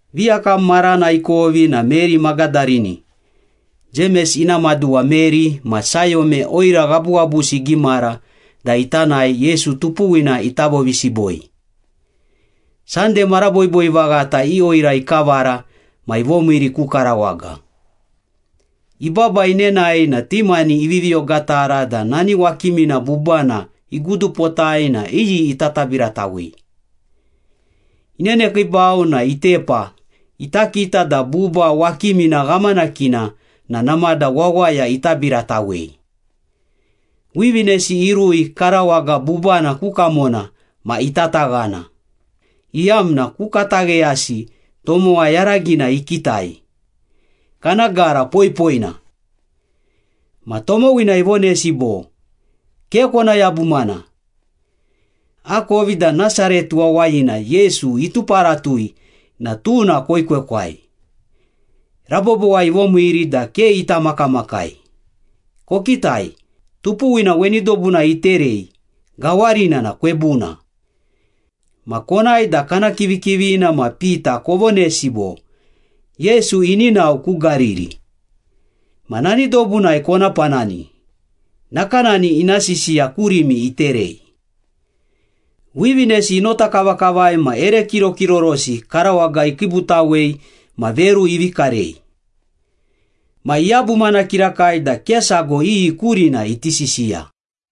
Viyakam marana ikovi na Meri Magadarini, Jemes ina maduwa Meri ma Sayome oira ghabughabusi igimara da ita nae Yesu tupuwina ita vovisiboi. Sande mara boiboi vaghata i oira ikavara ma ivomiiri ku karawaga. Ibaba inenae na ti mani ivivi ogatara da nani wakimina bubana igudupotai na iyi ita tabiratawei. Inenekiibau na itepa ita kita da buba wakimina ghamanakina na namada wawaya itabiratawei. Wivinesi irui karawaga bubana ku kamona ma itataghana, iyamna ku katagheyasi tomowa yaragina ikitai, kana gara poipoina. Ma tomowina ivonesi bo, “Ke kona yabumana. Akovi da Nasaret wawayina Yesu ituparatui na tuna koekwekwai. Rabobowai ivomiiri da ke ita makamakai. Kokitai, tupuwina weni dobunai iterei, gawarina na kwebuna. Ma konae da kana kivikivina ma Pita kovonesi bo, ‘Yesu ini nao ku Gariri. Ma nani dobunai kona panani, nakanani ina sisiya kurimi iterei.’” Wivinesi inotakavakavai ma ere kirokirorosi karawaga ikiibutawei ma veru ivi karei. Ma iyabumana kirakai da ke sago iyi kurina iti sisiya.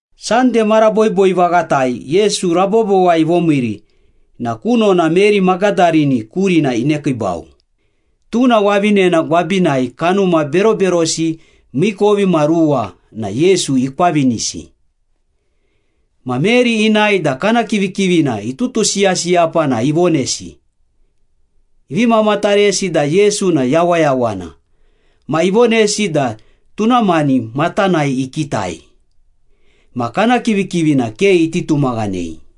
Sande mara boiboi vaghatai Yesu rabobowai ivomiiri na kunona Meri Magadarini kurina inekiibau, tuna wavinena gwabinai kanuma beroberosi miikovimaruwa na Yesu ikwavinisi. Ma Meri inae da kana kivikivina itutusiyasiyapa na ivonesi. Ivi mamataresi da Yesu na yawayawana, ma ivonesi da tuna mani matanai ikitai. Ma kana kivikivina ke iti tumaghanei.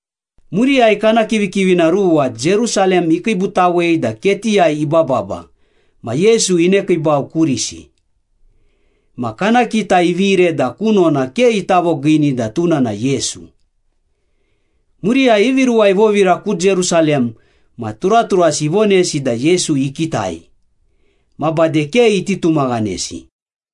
Muriyai kana kivikivina ruwa Jerusalem ikiibutawei da ketiyai ibababa ma Yesu inekiibau kurisi. Ma kana kita ivire da kunona ke ita vogiini da tuna na Yesu. Muriyai ivi ruwa ivovira ku Jerusalem ma turaturasi ivonesi da Yesu ikitai. Ma bade ke iti tumaghanesi.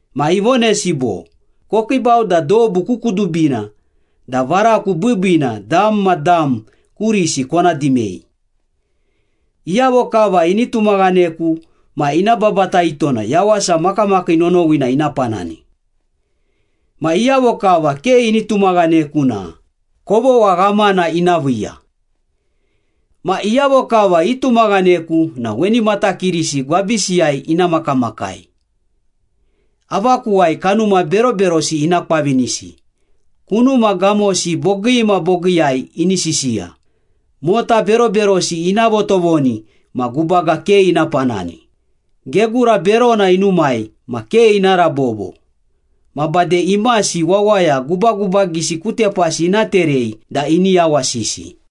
Ma ivonesi bo, “Kokiibau da dobu ku kudubina, da varaku biibiina dam ma dam kurisi kona dimei. Iyavo kava ini tumaghaneku ma ina babataito na yawasa makamakii nonowina ina panani. Ma iyavo kava ke ini tumaghaneku na kovogha ghamana ina viiya. Ma iyavo kava itumaghaneku na weni matakirisi gwabisiyai ina makamakai. Avakuwai kanuma beroberosi ina kwavinisi, kunuma gamosi bogii ma bogiiyai ini sisiya, mota beroberosi ina votovoni ma gubaga ke ina panani, gegura berona inumai ma ke ina rabobo, ma bade imasi wawaya gubagubagisi ku tepasi ina terei da ini yawasisi.”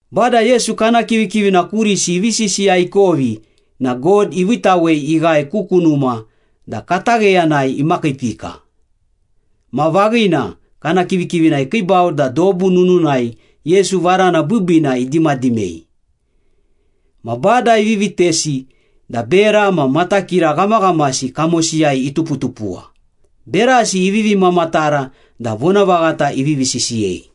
Bada Yesu kana kivikivina kurisi ivi sisiya ikovi na God iviitawei ighae ku kunuma da katagheyanai imakiipika. Ma vaghina, kana kivikivina ikiibau da dobu nununai Yesu varana biibiina idimadimei. Ma Bada ivi vitesi da bera ma matakira ghamaghamasi kamosiyai ituputupuwa, berasi ivivi mamatara da vonavaghata ivivi sisiyei.